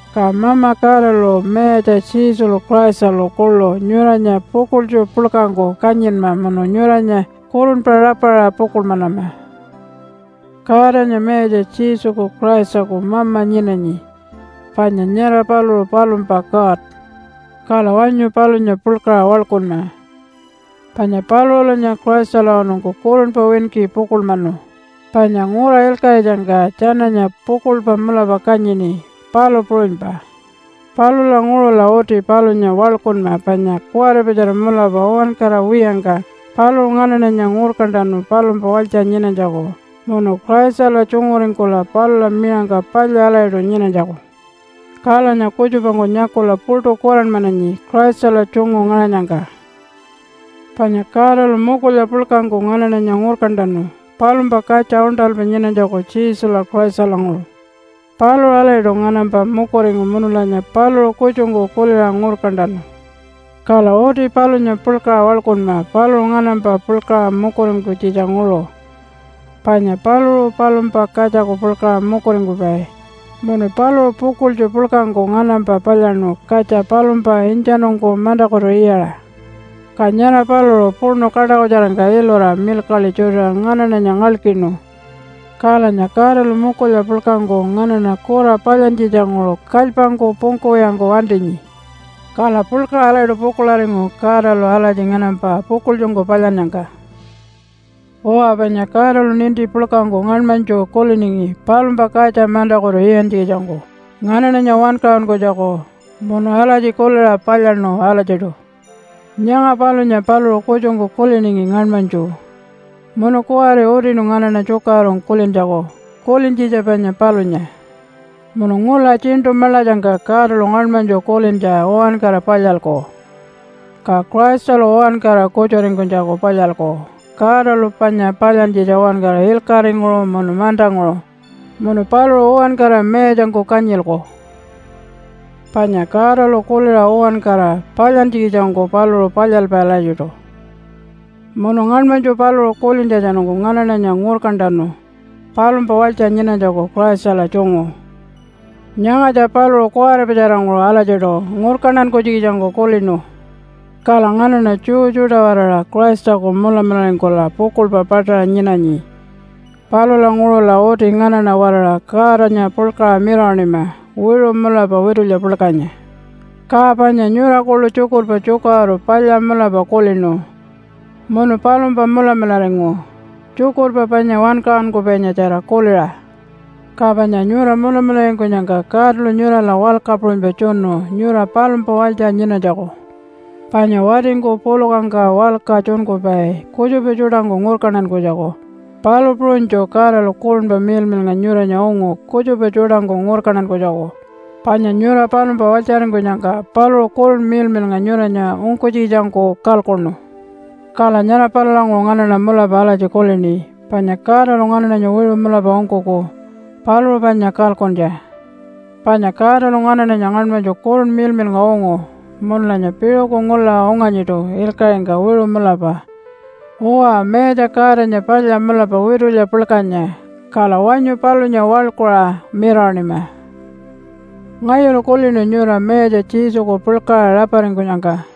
Ka Mama Godalu Mayatja Jesulu Christalu kuḻu nyuranya pukuḻtju puḻkangku kanyinma munu nyuranya kurunpa rapaṟa pukuḻmanama. Godanya Mayatja Jesuku Christaku mama nyinanyi, panya nyara paluṟu palumpa God. Kala wanyu palunya puḻkaṟa waḻkunma, panya paluṟulanya Christalawanungku kurunpa winki pukuḻmanu, panya ngura ilkaṟitjangka tjananya pukuḻpa mulapa kanyini, palu puṟunypa. Palulanguṟula uti palunya waḻkunma panya kuwaripatjara mulapa uwankara wiyangka paluṟu nganaṉanya ngurkantanu palumpa walytja nyinanytjaku munu Christala tjunguringkula palula miṟangka palya alatjiṯu nyinanytjaku. Kalanya kutjupangku nyakula puṯu kuranmananyi Christala tjungu ngaṟanyangka. Panya Godalu mukulya puḻkangku nganaṉanya ngurkantanu palumpa katja uṉṯalpa nyinanytjaku, Jesula Christalanguṟu. Paluṟu alatjiṯu nganampa mukuringu munulanya paluṟu kutjungku kuliṟa ngurkantanu. Kala uti palunya puḻkaṟa waḻkunma paluṟu nganampa puḻkaṟa mukuringkunytjitjanguṟu, panya paluṟu palumpa katjaku puḻkaṟa mukuringkupai munu paluṟu pukuḻtju puḻkangku nganampa palyaṉu katja palumpa intjanungku mantakutu iyaṟa. Ka nyara paluṟu puṉu kaṯakutjarangka ilura milkaḻi tjutiṟa nganaṉanya ngalkinu, kalanya Godalu mukulya puḻkangku nganaṉa kura palyantjitjanguṟu kalypangku pungkuwiyangku wantinyi. Kala puḻkaṟa alatjiṯu pukuḻaringu Godalu alatji nganampa pukuḻtjungku palyannyangka. Uwa panya Godalu ninti puḻkangku ngaṉmanytju kuliningi palumpa katja mantakutu iyantjikitjangku nganaṉanya wankaṟunkunytjaku, munu alatji kuliṟa palyaṉu alatjiṯu. Nyanga palunya paluṟu kutjungku kuliningi ngaṉmanytju munu kuwari utinu nganaṉa tjukaṟurungku kulintjaku kulintjitja panya palunya. Munu ngula Tjiṉṯu Maḻatjangka Godalu ngaṉmanytju kulintja uwankara palyalku, ka Christalu uwankara kutjuringkunytjaku palyalku Godalu panya palyantjitja uwankara ilkaṟinguṟu munu mantanguṟu, munu paluṟu uwankara mayatjangku kanyilku. Panya Godalu kuliṟa uwankara palyantjikitjangku paluṟu palyalpai alatjiṯu. Munu ngaṉmanytju paluṟu kulintjatjanungku nganaṉanya ngurkantanu palumpa walytja nyinanytjaku Christala tjungu. Nyangatja paluṟu kuwaripatjaranguṟu alatjiṯu ngurkantankunytjikitjangku kulinu. Kala nganaṉa Jew tjuṯa-waraṟa Christaku mulamularingkula pukuḻpa paṯaṟa nyinanyi. Palulanguṟula uti nganaṉa-waraṟa Godanya puḻkaṟa mirawaṉima wiṟu mulapa witulya puḻkanya. Ka panya nyura kuḻu tjukurpa tjukaṟuru palya mulapa kulinu munu palumpa mulamularingu, tjukurpa panya wankaṟunkupaitjara kuliṟa. Ka panya nyura mulamularingkunyangka Godalu nyurala walka puṟunypa tjunu nyura palumpa walytja nyinanytjaku, panya watingku pulukangka walka tjunkupai kutjupa tjuṯangku ngurkantankunytjaku, palu puṟunytju Godalu Kurunpa Miḻmiḻnga nyuranya ungu kutjupa tjuṯangku ngurkantankunytjaku, panya nyura palumpa walytjaringkunyangka paluṟu Kurunpa Miḻmiḻnga nyuranya ungkunytjikitjangku kalkuṉu. Kala nyara palulanguṟu nganaṉa mulapa alatji kulini, “Panya Godalu nganaṉanya wiṟu mulapa ungkuku paluṟu panya kalkuntja.” Panya Godalu nganaṉanya ngaṉmanytju Kurunpa Miḻmiḻnga ungu munulanya piṟuku ngula unganyiṯu ilkaṟingka wiṟu mulapa. Uwa, Mayatja Godanya palya mulapa witulya puḻkanya, kala wanyu palunya waḻkuṟa mirawaṉima. Ngayulu kulinu nyura Mayatja Jesuku puḻkaṟa raparingkunyangka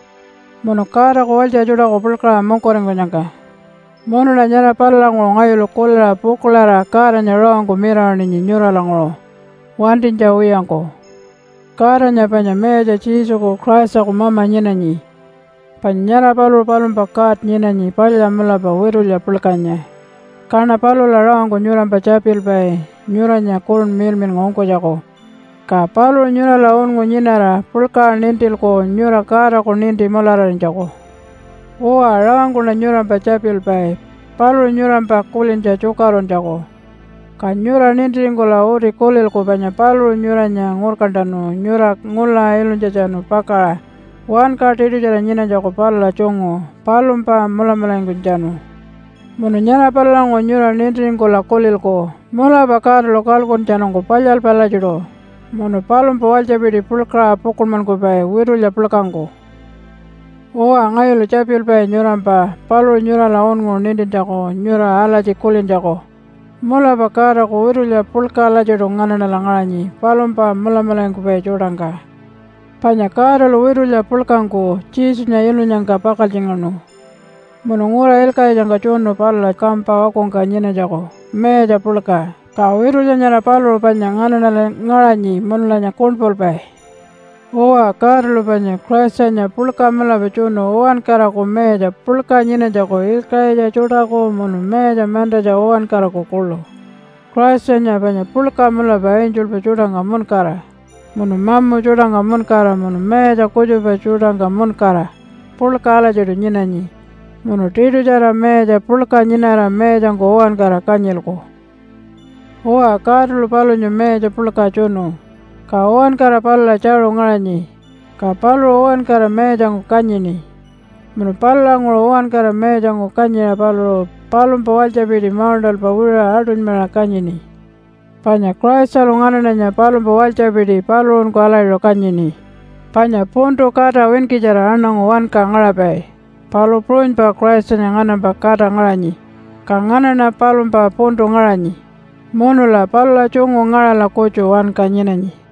munu Godaku walytja tjuṯaku puḻkaṟa mukuringkunyangka. Munuṉa nyara palulanguṟu ngayulu kuliṟa pukuḻarira Godanya rawangku mirawaṉinyi nyuralanguṟu wantinytja wiyangku. Godanya panya Mayatja Jesuku Christaku mama nyinanyi, panya nyara paluṟu palumpa God nyinanyi palya mulapa witulya puḻkanya. Kaṉa palula rawangku nyurampa tjapilpai nyuranya Kurunpa Miḻmiḻnga ungkunytjaku. Ka paluṟu nyurala unngu nyinara puḻkaṟa nintilku nyura Godaku ninti mulararinytjaku. Uwa, rawangkuṉa nyurampa tjapilpai paluṟu nyurampa kulintja tjukaṟuruntjaku. Ka nyura nintiringkula uti kulilku panya paluṟu nyuranya ngurkantanu nyura ngula ilunytjatjanu pakaṟa wanka tiṯutjara nyinanytjaku palula tjungu, palumpa mulamularingkunytjatjanu. Munu nyara palulanguṟu nyura nintiringkula kulilku, “Mulapa Godalu kalkuntjatjanungku palyalpai alatjiṯu munu palumpa walytjapiti puḻkaṟa pukuḻmankupai witulya puḻkangku.” Uwa ngayulu tjapilpai nyurampa paluṟu nyurala unngu nintintjaku nyura alatji kulintjaku, “Mulapa Godaku witulya puḻka alatjiṯu nganaṉala ngaṟanyi palumpa mulamularingkupai tjuṯangka.” Panya Godalu witulya puḻkangku Jesunya ilunyangka pakaltjingaṉu munu ngura ilkaṟitjangka tjunu palula kampa wakungka nyinanytjaku mayatja puḻka. Ka witulya nyara paluṟu panya nganaṉala ngaṟanyi munulanya kuṉpulpai. Uwa, Godalu panya Christanya puḻka mulapa tjunu uwankaraku mayatja puḻka nyinanytjaku ilkaṟitja tjuṯaku, munu mayatja mantatja uwankaraku kuḻu. Christanya panya puḻka mulapa angelpa tjuṯangka muṉkara, munu mamu tjuṯangka muṉkara munu mayatja kutjupa tjuṯangka muṉkara puḻka alatjiṯu nyinanyi munu tiṯutjara mayatja puḻka nyinara mayatjangku uwankara kanyilku. Uwa, Godalu palunya Mayatja puḻka tjunu, ka uwankara palula tjaṟu ngaṟanyi, ka paluṟu uwankara mayatjangku kanyini. Munu palulanguṟu uwankara mayatjangku kanyiṟa paluṟu palumpa walytjapiti mauṉṯalpa wiṟuṟa aṯunymaṟa kanyini. Panya Christalu nganaṉanya palumpa walytjapiti paluṟunku alatjiṯu kanyini. Panya puntu kata winkitjara aṉangu wanka ngaṟapai, palu puṟunypa Christanya nganampa kata ngaṟanyi, ka nganaṉa palumpa puntu ngaṟanyi, munula palula tjungu ngaṟala kutju wanka nyinanyi.